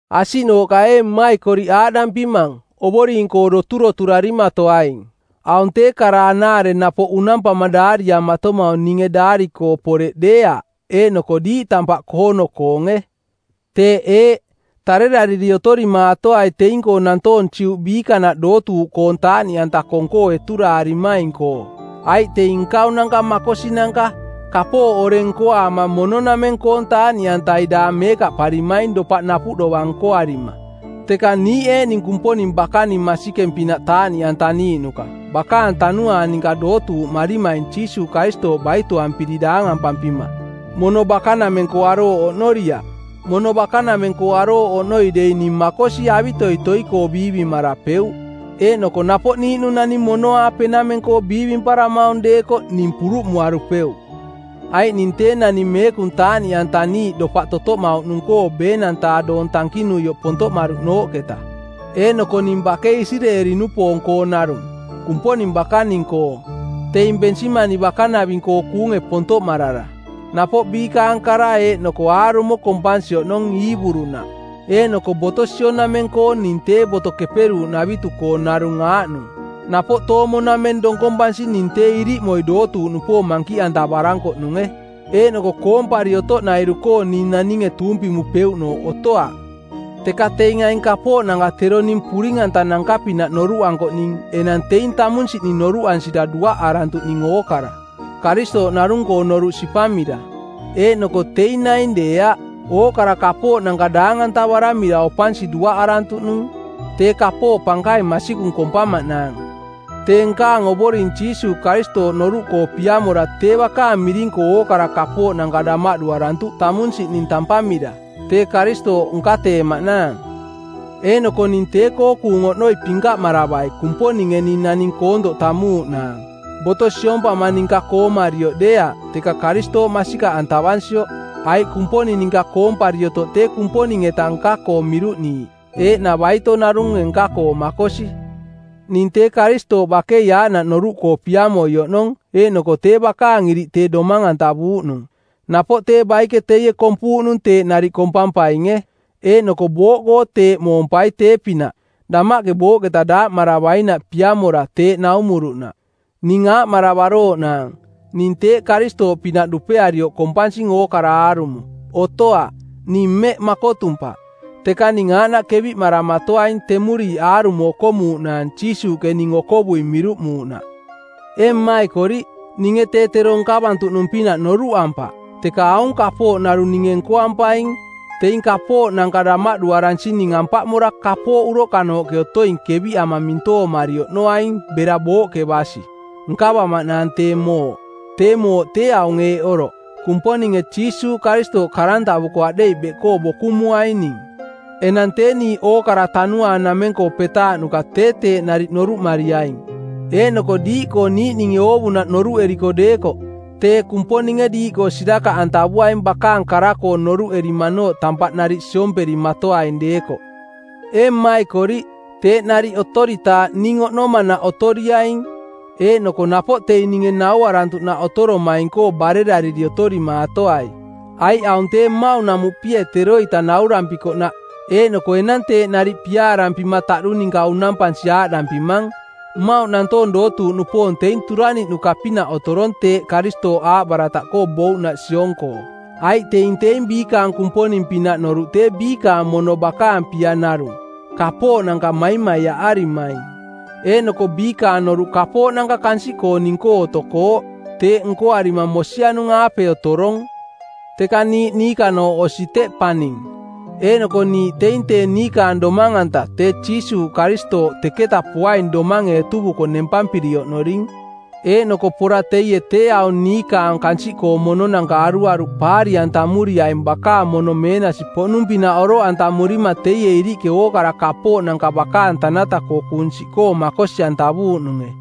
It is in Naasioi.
Asiꞌnooꞌka ee mmaikoriꞌ aaꞌdampimang, Ovoring-koo doturoturarimatoaing. Aung tee kara anaare napoꞌ unampama daariamatomaung ninge daari-koo poreꞌ deeaꞌ eeꞌnoko diiꞌ tampaꞌ koono-koonge. Teeꞌ eeꞌ: Tarerariri otorimaatoai teing-koo nantoong-koo Juꞌ biikanaꞌ dootuuꞌ koong taaꞌniꞌanta kong-koo eturaarimaing-koo, aiꞌ teing nkaunanka makosinanka, kapooꞌ oreng nkoaama mono-nameng-koong taaꞌniꞌantai daang meekaꞌparimaing dopaꞌ napuꞌ dovang nkoarima. Teka niiꞌ eeꞌning Kumponing bakaning masikeng-pinaꞌ taaꞌniꞌantaniiꞌnuka, bakaang Tanuaang ninka dootuuꞌmarimaing Jiisuuꞌ Karistooꞌ baitoampiri daangampampima, mono bakanameng-koo arooꞌ oꞌnoriaꞌ. Mono bakanameng-koo arooꞌ oꞌnoi dei ning makosi avitoitoi-koo biivimarapeuꞌ, eeꞌnoko napoꞌ niiꞌnung naning mono-aapenameng-koo biivimparamaung deekoꞌ ning puruꞌmuarupeuꞌ. Aiꞌ ning tee naning meekung taaꞌniꞌantaniiꞌ dopaꞌ totoꞌmauꞌnung-koo ˜beenang-taa doong tankinuioꞌ pontoꞌmaruꞌnooꞌketa. Eeꞌnoko ning bakei Isireeli-nupoong-koo narung, Kumponing bakaning-koo, teing Bensimani bakanaving-koo kuunge pontoꞌmarara. Napoꞌ biikaang kara eeꞌnoko aarumo kompansi oꞌnong, Iiburunaꞌ. Eeꞌnoko boto sionameng-koo ning tee Boto Keperuuꞌnavitu-koo narung aaꞌnung. Napoꞌ toomo-nameng donkompansi ning tee iriꞌmoi dootuuꞌnupoong mankiꞌantavarankoꞌnunge. Eeꞌnoko koompari otoꞌnairu-koo ning naninge tuumpimupeuꞌnooꞌ otoaꞌ. Teka teing aing kapooꞌnanka tero ning puring-antananka-pinaꞌ noruꞌankoꞌning enang teing tamunsiꞌning noruꞌansira duaꞌarantuꞌning ookara, Karistooꞌ narung-koo noruꞌ sipamira. Eeꞌnoko teing naing deeaꞌ, ookara kapooꞌnanka daang-antavaramira opansi duaꞌarantuꞌ nung tee kapooꞌ pankaing masikung kompamaꞌnaang. Tee nkaang Ovoring Jiisuuꞌ Karistooꞌ noruꞌkoo piamora tee bakaang miring-koo ookara kapooꞌnanka damaꞌduarantuꞌ tamunsiꞌning tampamira, tee Karistooꞌ nkateemaꞌnaang. Eeꞌnoko ning tee-koo kuung oꞌnoi pinkaꞌmaravai Kumponinge ning naning koontoꞌ tammuuꞌnaang, boto siompama ninka koomarioꞌ deeaꞌ, teka Karistooꞌ masikaꞌantavansioꞌ. Aiꞌ Kumponing ninka koompari otoꞌ tee Kumponing-eta nka-koo miruꞌniiꞌ, eeꞌna baito narunge nka-koo makosi. Ning tee Karistooꞌ bakei aaꞌnaꞌ noruꞌkoo piamoi oꞌnong eeꞌnoko tee bakaang iriꞌ tee domang-antavuuꞌnung; napoꞌ tee baike teie kompuuꞌnung teeꞌ nariꞌ kompampainge; Eeꞌnoko booꞌkoo teeꞌ moompai tee-pinaꞌ, damaꞌke booꞌketa daaꞌmaravainaꞌ piamora teeꞌ naumuruꞌnaꞌ. Ning aaꞌmaravarooꞌnang, “Ning teeꞌ Karistooꞌpinaꞌ dupearioꞌ kompansing ookara aarumo.” Otoaꞌ. Ning mmeꞌ makotumpaꞌ. Teka ning aaꞌnaꞌ keviꞌmaramatoaing temuriiꞌ aarumo okomuuꞌnaang Jiisuuꞌke ning okovui miruꞌmuuꞌnaꞌ. Ee mmaikoriꞌ, ninge tee tero nkavantuꞌnung-pinaꞌ noruꞌampaꞌ, teka aung kapooꞌ narung ninge nkoampaing: Teing kapooꞌnanka damaꞌduaransining ampaꞌmora kapooꞌ uroꞌkanooꞌke otoing keviꞌama mintoomari oꞌnoaing bera booꞌke basi, nkavamaꞌnaang tee mooꞌ. Tee mooꞌ tee aung eeꞌ oroꞌ: Kumponinge Jiisuuꞌ Karistooꞌ karantavuko˜ aꞌdeiꞌ beꞌkoo bokumuaing ning. Enang tee niiꞌ ookara tanuaang nameng-koo petaaꞌnuka tee teeꞌ nariꞌ noruꞌmariaing. Eeꞌnoko diiꞌkoo niiꞌninge oovunaꞌ noruꞌeriko deekoꞌ, tee Kumponinge diiꞌkoo sirakaꞌantavuaing bakaang kara-koo noruꞌerimanooꞌ tampaꞌ nariꞌ siomperimatoaing deekoꞌ. Ee mmaikoriꞌ, teeꞌ nariꞌ otoritaaꞌ ning oꞌnomanaꞌ otoriaing eeꞌnoko napoꞌ teing ninge nauarantuꞌnaꞌ otoromaing-koo barerariri otorimaatoai. Aiꞌ aung tee mmauꞌnamuꞌpie teroita naurampikoꞌnaꞌ eeꞌnoko enang teeꞌ nariꞌ piaarampima taꞌdu ninka unampansi aaꞌdampimang: Mmauꞌ nantoong dootuuꞌnupoong teing turaniꞌnuka-pinaꞌ otorong teeꞌ Karistooꞌ aaꞌbarataꞌkoo bouꞌnaꞌ siong-koo. Aiꞌ teing teing biikaang kumponing-pinaꞌ noruꞌ tee biikaang mono bakaang pia narung, kapooꞌnanka maimaiaꞌarimaing, eeꞌnoko biikaang noruꞌ kapooꞌnanka kansiꞌkooning-koo otokooꞌ. Teeꞌ nkoarima mosianung-aape otorong. Teka niiꞌ niikanooꞌ osi teꞌ paning. Eeꞌnoko niiꞌ teing tee niikaang Domang-anta tee Jiisuuꞌ Karistooꞌ teketa poaing domange etuvuko nempampiri oꞌnorining. Eeꞌnoko pora teie tee aung niikaang kansiꞌkoong mononanka aruaruꞌ paari-antamuriaing bakaang mono meenasi-poꞌnung-pinaꞌ oroꞌantamurima teie iriꞌke ookara kapooꞌnanka bakaang tanata-koo kuung siꞌkoo makosi-antavuuꞌnunge.